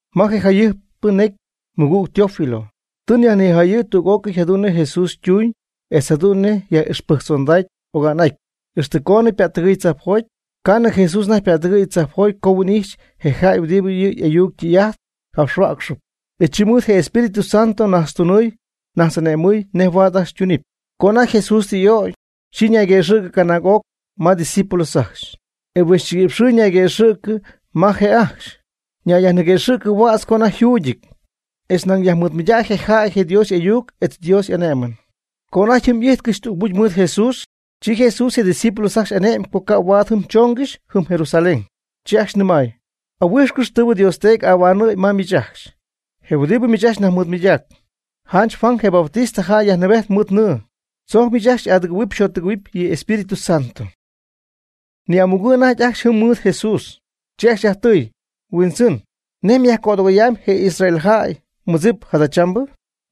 Ma je jayɨjp'atypɨ necy, mɨgüg Teófilo, tɨ nyajnijayɨ̈y tüg'ócɨy jadu'n nej Jesús ytuuñ etz jadu'n nej yaj'ixpɨjctzondacy oga'n'aty, ixtɨ coonɨ ypättɨgɨɨy tzajpjoty. Ca'nɨ Jesús anajty ypättɨgɨ̈y tzajpjoty co huin'ijxy je' yjäy huɨdibɨ yɨ' y'ayuc ytɨy'ajt capxhuäcxɨɨb, e chi mɨɨd je Espíritu Santo najtztunɨɨy najtz'ane'mɨɨy nej huaad ajcxy ytunɨpy. Co anajty Jesús y'ögy, chi ñayguëxɨ̈cɨ canaag'oc ma je' ydiscípulos ajcxy, e huixchiguïpx xɨɨ ñayquëxɨ̈go'cɨ ma je' ajcxy, yajniquëxɨ̈gy huädz co anajty yjuugyɨty, etz nañ yajmɨɨdmɨydacy je' yjäy je Dios y'ayuc etz Dios y'ané'mɨn. Co anajty jɨm ijtcɨxy tügmucy mɨɨd Jesús, chi Jesús je' ydiscípulos ajcxy ane'my co ca' huaad jɨm choongɨxy jɨm Jerusalén. Chi ajcxy nɨmay: ―Ahuijxcɨx tɨɨbɨ Dios nDeedy ahuanɨ̈y ma miich ajcxy, je huɨdibɨ miich ajcxy nyajmɨɨdmɨydägy. Janch Juan je Bautista jäy yajnɨɨbejt mɨɨd nɨɨ, tzojc miich ajcxy xy'adɨgɨ̈huɨpy xyjottɨgɨ̈huɨpy yɨ Espíritu Santo. Ni'amugɨ̈ anajty ajcxy jɨm mɨɨd Jesús, chi ajcxy yajtɨɨy: ―¿Huindzɨn, nej myajcödɨgoyamy je Israeljäy ymɨdzip jadachambɨ?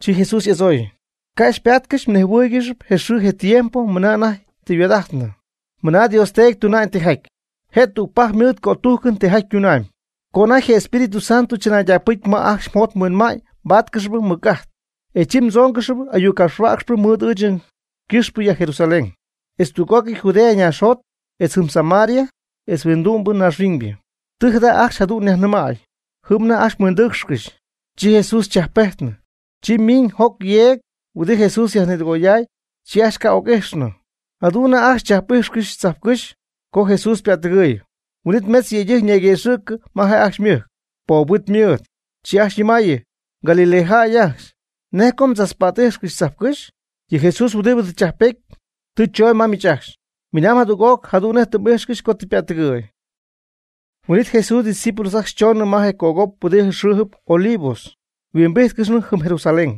Chi Jesús y'adzooy: ―Ca' xypaatcɨxy mnejhuɨɨygɨxy je xɨɨ je tiempo mɨna anajty tɨ yhuaad'ajtnɨ, mɨna Dios Teedy tuna'ñ tijaty, je' tügpajc mɨɨd cötújcɨn tijaty ytunamy. Co anajty je Espírito Santo chɨnaydacpɨcy ma ajcxy mjot mhuinma'ñ mbaatcɨxp mɨc'ajt. E chi mdzoongɨxp ayuc capxhuäcxpɨ mɨɨd ɨɨch ycɨxpɨ ya Jerusalén, etz tüg'ócɨy Judea ñaaxjot, etz jɨm Samaria, etz huindu'my ñaaxhuiñybɨ. Tɨ jada ajcxy jadu'n yajnɨmäy, jɨm anajty ajcxy yhuindɨɨcxcɨxy, chi Jesús chajppejtnɨ. Chi miñ joc yeeg huɨdi Jesús yajnïdɨgoyday, chi ajcxy ca' ocjac'ijxnɨ. Jadu'n anajty ajcxy chachpät'íjxcɨxy tzajpcɨ́xy, co Jesús ypättɨgɨɨy. Huin'it mejtz yëydɨjc ñayguëxɨ̈cɨ ma je' ajcxy ymɨjc, poob huit mɨɨd, chi ajcxy ñɨmaayɨ: ―Galilea jäy ajcxy, ¿nej co mdzachpät'ijxcɨxy tzajpcɨ́xy? Yɨ Jesús huɨdibɨ tɨ chajppety, tɨ chooñ ma miich ajcxy, minaamb jadüg'oc jadu'n nej tɨ m'ijxcɨxy co tɨ ypättɨgɨ̈y. Huin'it Jesús ydiscípulos ajcxy choonɨ ma je cögop huɨdi xɨɨjɨp Olivos, yhuimbíjtcɨxnɨ jɨm Jerusalén,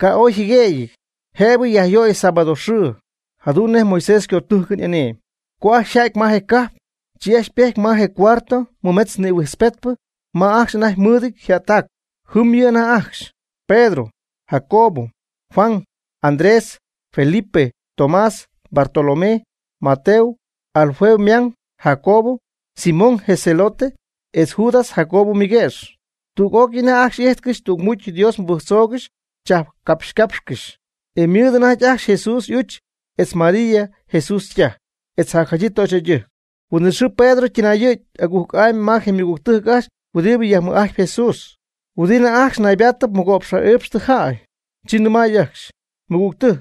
ca' ooy yjɨguëgyɨty, jëbɨ yajyöy sábado xɨɨ, jadu'n nej Moisés ycötújcɨn y'ane'my. Co ajcxy yja'ty ma je cajp, chi ajcxy ypejty ma je cuarto mɨmetz nïhuijtzpetypɨ ma ajcxy anajty mɨɨdɨty yjättac. Jɨm yɨ' anajty ajcxy: Pedro, Jacobo, Juan, Andrés, Felipe, Tomás, Bartolomé, Mateo, Alfeo ymang Jacobo, Simón je Zelote etz Judas Jacobo ymɨguëx. Tüg'ócɨy anajty ajcxy y'ijtcɨxy tügmucy Dios mɨbɨjctzoogɨxy chajpcapxycapxcɨxy. Ymɨɨd ajcxy anajty Jesús y'uch etz María Jesús ytaj, etz jacjadyii töxyjäydɨjc. Huin'it xɨɨ Pedro ytɨnayɨ̈gy agujc'amy ma je ymɨgügtɨjc ajcxy huɨdibɨ yajmɨj'ajtp Jesús, huɨdi anajty ajcxy naybaatɨp mɨgo'px ja'iipxtɨ jäy, chi nɨmay ajcxy: ―Mɨgügtɨjc,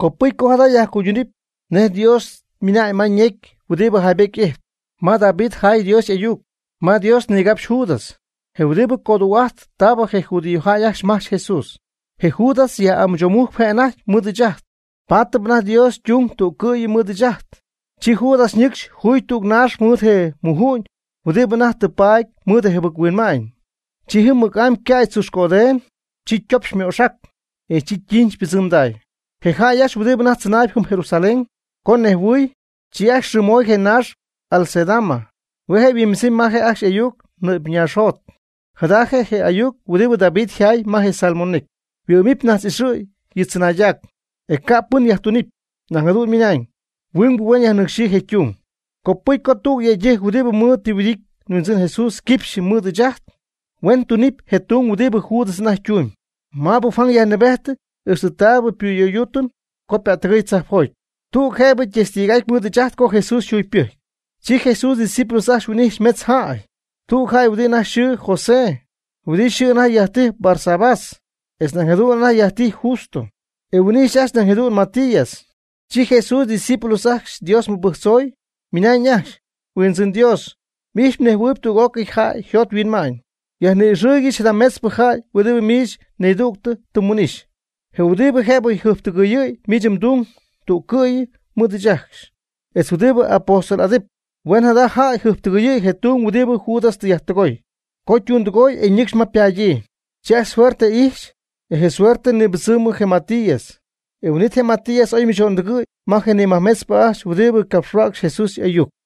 copɨcy co jada yajcuydúnɨpy nej Dios ymɨnañ ma ñecy huɨdi jaybety ijtp, ma David jaay Dios y'ayuc, ma Dios nigapxy Judas. Je'huɨdi coduu'ajt taabɨ je judíojäy ajcxy majch Jesús. Je Judas yaj'amɨchomujcp je' anajty mɨɨd ɨɨch ajt, paatɨp anajty Dios ytung tú'cɨy mɨɨd ɨɨch ajt. Chi Judas ñɨcxy juy tüg naax mɨɨd je muju'ñ huɨdibɨ anajty tɨ paady mɨɨd yjɨbɨc-huinma'ñ. Chi jɨm mɨc'amy ycäy tzuxcödeeñ, chi ytopxy ymooxac, e chi ytiinch ypɨdzɨmday. Je jäy ajcxy huɨdibɨ anajty tzɨnaayb jɨm Jerusalén, co nejhuɨɨy, chi ajcxy yxɨɨmoy je naax Acéldama, hue' je' yhuimbɨdzɨmy ma je' ajcxy ayuc, nɨ'py ñaaxjot. Jada je' je ayuc huɨdibɨ David yjaay ma je Salmo necy: Huɨ'mɨp najtz'ixɨ̈y yɨ' chɨnaaydac. E ca' pɨn yajtunɨpy. Nañ jadu'n ymɨna'ñ: Huingbɨ huen yajnɨcxyii je' ytung. Copɨcy co tüg yëydɨjc huɨdibɨ mɨɨd tɨ yhuɨdity nHuindzɨn Jesús quipxyɨ mɨɨd ɨɨch ajt, huen tunɨpy je tung huɨdibɨ Judas anajty ytumyb, maab Juan yajnɨɨbety ixtɨ taabɨ xypuyöyduutɨm co pättɨgɨy tzajpjot, tüg jëbɨ testig'aty mɨɨd ɨɨch ajt co Jesús yjugypɨjcy. Chi Jesús ydiscípulos ajcxy huin'ijxy mejtz jäy: tüg jäy huɨdi anajty yxɨɨ José, huɨdi yxɨɨ anajty yajtijy Barsabás etz nañ jadu'n anajty yajtijy Justo. E huin'ijxy ajcxy nañ jadu'n Matías. Chi Jesús ydiscípulos ajcxy Dios mɨbɨjctzoy, ymɨnañ ajcxy: ―Huindzɨn Dios, m'ijxyp mnejhuɨɨyb tüg'ócɨy jäy yjot yhuinma'ñ, yajni'ixɨɨygɨch jada metzpɨ jäy huɨdibɨ miich nidügtɨ tɨ nhuin'ixy, je huɨdibɨ jëbɨ jɨjptɨgɨyɨ̈y miich mdung tú'cɨy mɨɨd ɨɨch ajcxy, etz huɨdibɨ apóstol'adɨp. Huen jada jäy jɨjptɨgɨyɨ̈y je tung huɨdibɨ Judas tɨ yajtɨgooy, co ytundɨgooy e ñɨcxy ma ypaadyii. Chi ajcxy suerte ijxy, e je suerte ñibɨdzɨmnɨ je Matías. E huin'ítɨy je Matías oy ymɨcho'ndɨgɨ̈y ma je nimajtügpɨ ajcxy huɨdi ycapxhuäcxy Jesús y'ayuc.